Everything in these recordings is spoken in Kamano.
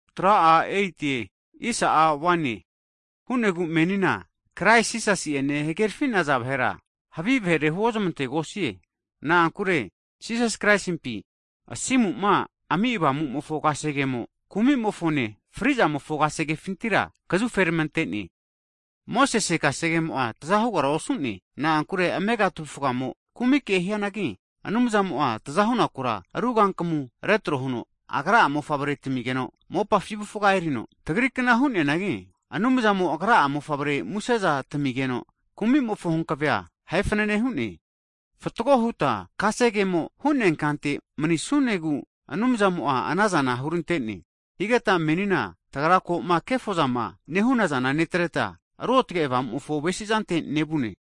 Ana hu'negu menina Krais Jisasi'ene hagerfi'naza vahera, havi vahere huozamantegosie. Na'ankure Jisas Kraisimpi asimuma ami Avamumofo kasegemo, kumimofone fri'zamofo kasegefintira kazuferamantene. Mosese kasegemo'a tazahugara osu'ne, na'ankure amega tavufgamo kumike hianagi, Anumzamo'a tazahunaku ru kankamu retro huno Agra'a Mofavre tamigeno mopafi avufga erino tagrikna hu'neanagi, Anumzamo Agra'a Mofavre museza tamigeno kumimofo hankavea ahe fanane hu'ne. Fatgo huta kasegemo hu'neankante manisunegu Anumzamo'a anazana hurantene. Higeta menina tagra ko'ma kefozama nehunazana netreta, Ruotge Avamumofo avesizante nevune.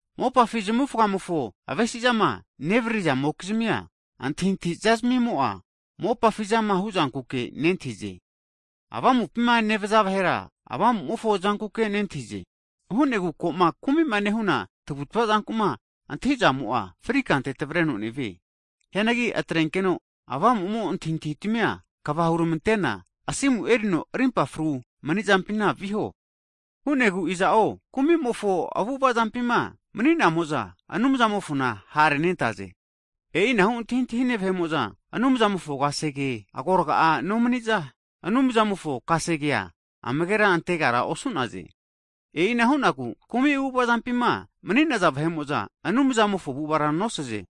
Mopafi zamufga'mofo avesizama nevririzamokizmia, antahintahiza zmimo'a mopafi zama huzankuke nentahize. Avamupima nevaza vahera Avamumofo zankuke nentahize. Hu'negu ko'ma kumima nehuna tavutava zanku'ma antahizamo'a fri kante tavreno nevie. Hianagi atrenkeno Avamumo antahintahitamia kva huramantena asimu erino rimpa frune manizampina viho. Hu'negu iza'zo kumimofo avu'ava zampima mani'namo'za Anumzamofona ha' renentaze. E'inahu antahintahine vahe'mo'za Anumzamofo kasege agorga'a nomaniza, Anumzamofo kasegea amagera antegara osu'naze. E'ina hu'negu kumi avu'avazampima mani'naza vahe'mo'za Anumzamofo avu'avara nosaze.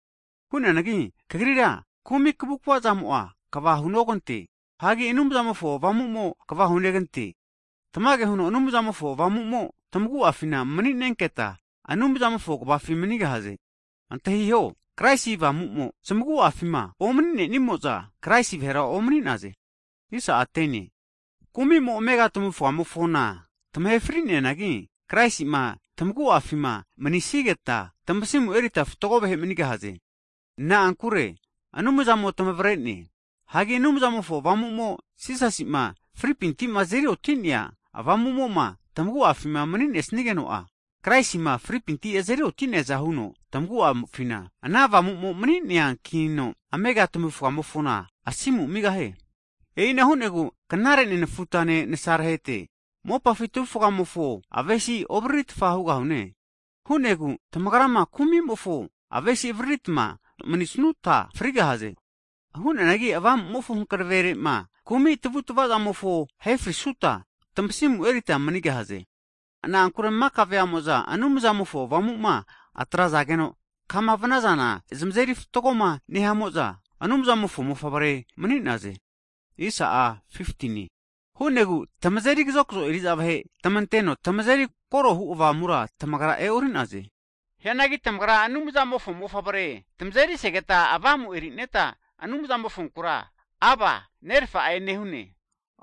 Hu'neanagi kagrira kumi kavukavazamo'a kava hunogante. Hagi Anumzamofo Avamumo kva hunegante. Tamage huno Anumzamofo Avamu'mo tamagu'afima mani'nenketa, Avamumofo kvafi manigahaze. Antahiho, Kraisi Avamumo zamagu'afima omani'nenimo'za, Kraisi vahera omani'naze. Kumimo amega tamavufga tamahe frigahianagi, Kraisima tamagu'afima maninesnigeta tamasimu erita fatgo vahe manigahaze. Na'ankure Anumzamo tamavrene. Hagi Anumzamofo Avamu'mo Jisasi'ma frinefinti' azeri oti'nea Avamu'mo'ma tamagu'afima mni'nesnigeno'a, Kraisima fripinti azeri oti'neaza huno tamagu'afina ana avamu mani'neankino, amega tamavufgamofona asimu amigahie. E'ina hu'negu knare nenefutane nasarahete, mopafi tavufgamofo avesizana ovriritfa hugahune. Hu'negu tamagrama kumimofo avesi avariritma manisnuta frigahaze. Hu'neanagi Avamumofo hanaverema kumi tamavutmavazamofo ahefrisuta, tamasimu erita manigahaze. Na'ankure maka veamo'za Anumzamofo Avamuma atrazageno, kama vnazana zmazeri fatgoma nehamo'za, Anumzamofo mofavre mani'naze. Ana hu'negu tamazeri kazokzo eri'za vahe tamanteno tamazeri korohu Avamura tamagra e'orinaze. Hianagi tamagra Anumzamofo mofavre hu Avamu erineta Anumzamofonkura Aba, Nerafa'e nehune!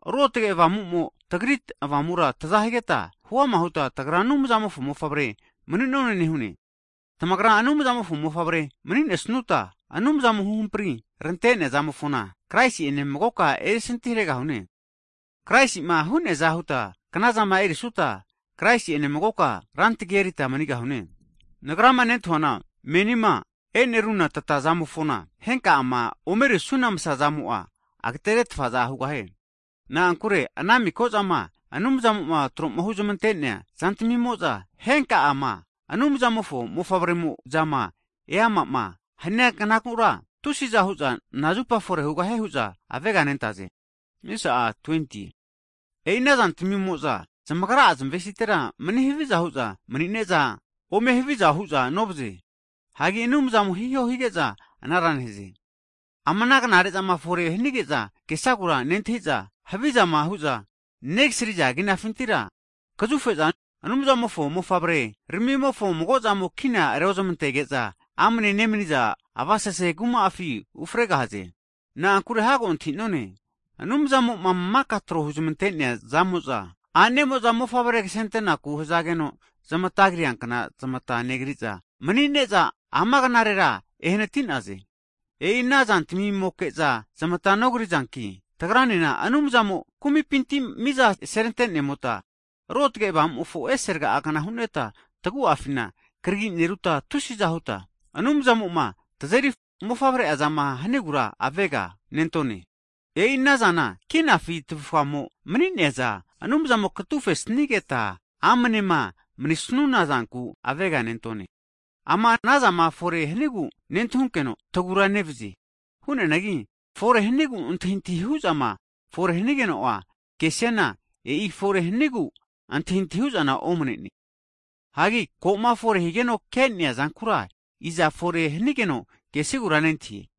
Ruotge Avamumo tagri avamura taza higeta huama huta, tagra Anumzamofo mofavre mani'none nehune. Tagrama Anumzamofo mofavre mni'nesnuta, Anumzamo huhampri rantenea zamofona Kraisi'ene magoka erisinti haregahune, Kraisi'ma hu'neaza huta knazama erisuta, Kraisi'ene magoka rantagi erita manigahune. Nagrama nentahuana, menima e'neruna tatazamofona, henka'ama omerisuna masazamo'a ageteretfaza hugahie. Na'ankure ana miko zama Anumzamo'ma tro'ma huzamante'nea zantmimo'za, henka'ama Anumzamofo mofavremo'zama e'ama'ma hanaza knagura, tusiza hu'za nazupa fore hugahie hu'za aveganentaze. E'i anaza tmimo'za zamagra'a zamvesitera mani haviza hu'za mni'neza ome haviza hu'za novaze, hagi Anumzamo hiho hige'za anara nehaze. Ama knare'zama fore hanige'za kesagu nentahize, havi'zama hu'za negasriza kinafintira kazufe'za Anumzamofo mofavre ramimofo mago'zamo kina re'ozmantege'za amne nemniza avasese kuma'afi ufregahze. Na'ankure hago antahinone, Anumzamo'ma maka tro huzmantenea zamo'za, a'nemo'za mofavre ksentenaku hzageno zmata kria kna zmata negrige'za mni'neza ama knarera enehanatize. E'i ana zantamimoke'za zmata e'norizanki, tagranena Anumzamo kumipinti miza serantenemota, Ruotge Avamumofo ese rga'a kna huneta tagua'fina krigi neruta, tusiza huta Anumzamoma tazeri mofavre'a zama hanigura avega nentone. E'i ana zana kinafi tavufgamo mni'neaza Anumzamo katufesnigeta fru huta mni'snuna zanku avega nentone. Ama ana zama fore hanigu nentahunkeno tagura nevazie. Hu'neanagi fore hanigu antahintahi hu'zama fore hanigeno kesiana, e'i fore hanigu antahitahi hu'zana omnene. Hagi koma fore higeno ke'nea zankura iza fore hanigeno kesigura nentahie.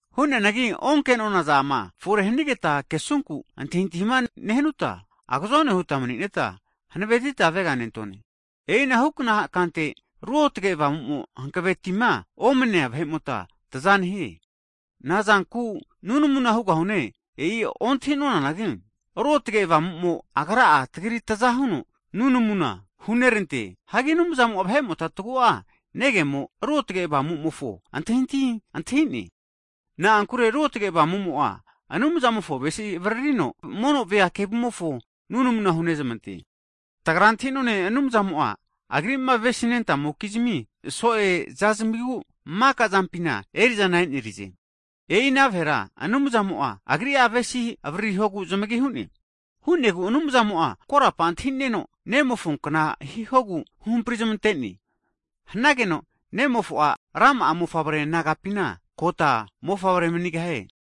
Hu'neanagi onke'nona zama fore hanigeta kesunku antahintahima nehanuta, agozone huta mni'neta hanavetita avega nentone. E'ina hukna kante, Ruotge Avamumo hanavetima omnenea vahe'mota tza nehie. Nazanku nunamuna hugahune, e'i ontahi nonanagi, Ruotge Avamumo Agra'a tagri taza huno nunamu hunerante. Hagi Anumzamo'a vahe'mota tagu'a negemo Ruotage Avamumofo antahintahia antahine. Na'ankure Ruotge Avamumo'a Anumzamofo avesiza avririno mono vea kevumofonku nunamu hunezmantie. Tagra antahinone, Anumzamo'a Agri'ma aves'nentamokizmi so'eza zamigu maka zamapina erizana enerize. E'ina vahera Anumzamo'a Agri'a avesi avririhogu zamagi hu'ne. Hu'negu Anumzamo'a korapa antahineno Nemofo kna hihogu huhamprizamante'ne, hanageno Nemofo'a rama'a mofavre nagapina kota mofavre manigahie.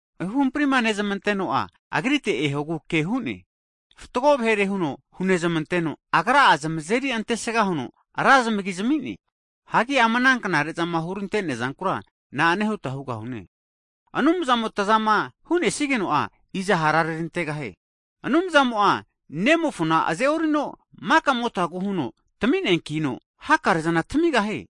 Huhamprima nezamanteno'a, Agrite ehogu ke hu'ne, Agra'a fatgo vahere huno hunezmanteno, Agra'a zamazeri antesga huno ra zamagi zami'ne. Hagi ama ana knare'zama hurantea zankura na'ane huta huga hune? Anumzamo tazama hu'nesigeno'a, iza hara rerantegahie? Anumzamo'a Nemofona aze'orino makamotagu huno tamineakino, hakarezana tamigahie.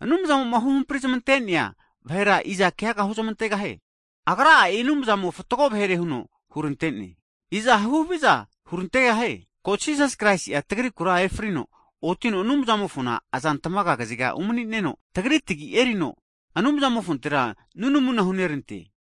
Anumzamo'ma huhampri zmantenea vahera iza keaga huzmantegahie? Agra e'i Anumzamo fatgo vahere huno hurantene. Iza huhaviza hurantegahie? Ko Jisas Kraisi'a tagrikura efrino otino Anumzamofona azantmaga kaziga umani'neno, tagri tagi erino Anumzamofontera nunamuna hunerante.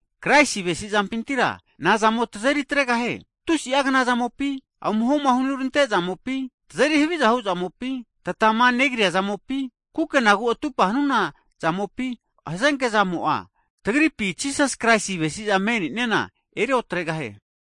Kraisi avesi zampintira nazamo tazeri atregahie? Tusi'a kna zamopi, amuhoma hurante zamopi, tazeri haviza huzamopi, tatamanegria zamopi, kukenagu atupa hanuna zamopi hazenke zamo'a tagripima Jisasi avesizama me'neana eri otregahie.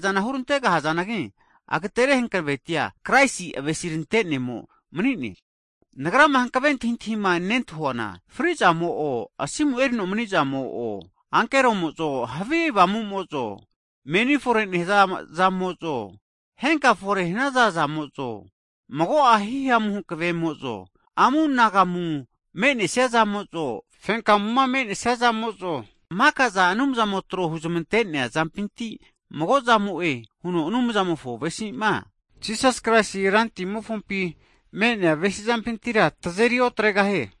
Hakare'zana hurantega hazanagi, agatere hankavetia Kraisi avesirante'nemo manine. Nagrama hankave antahintahima nentahuana, frizamo'o, asimu erino manizamo'o, ankeromo'zo, havi avamumozo, meni fore nehza zamozo, henka'a fore hanaza zamozo, mago'a hihamu hankvemozo, amunagumu menesia zamo'zo, fenkagamu menesia zamo'zo, makaza Anumzamo tro huzmante'nea zampinti mago' zamo'e huno Anumzamofo avesizama, Jisas Kraisi Rantmofompi menea avesi zampintira tazeri otregahie.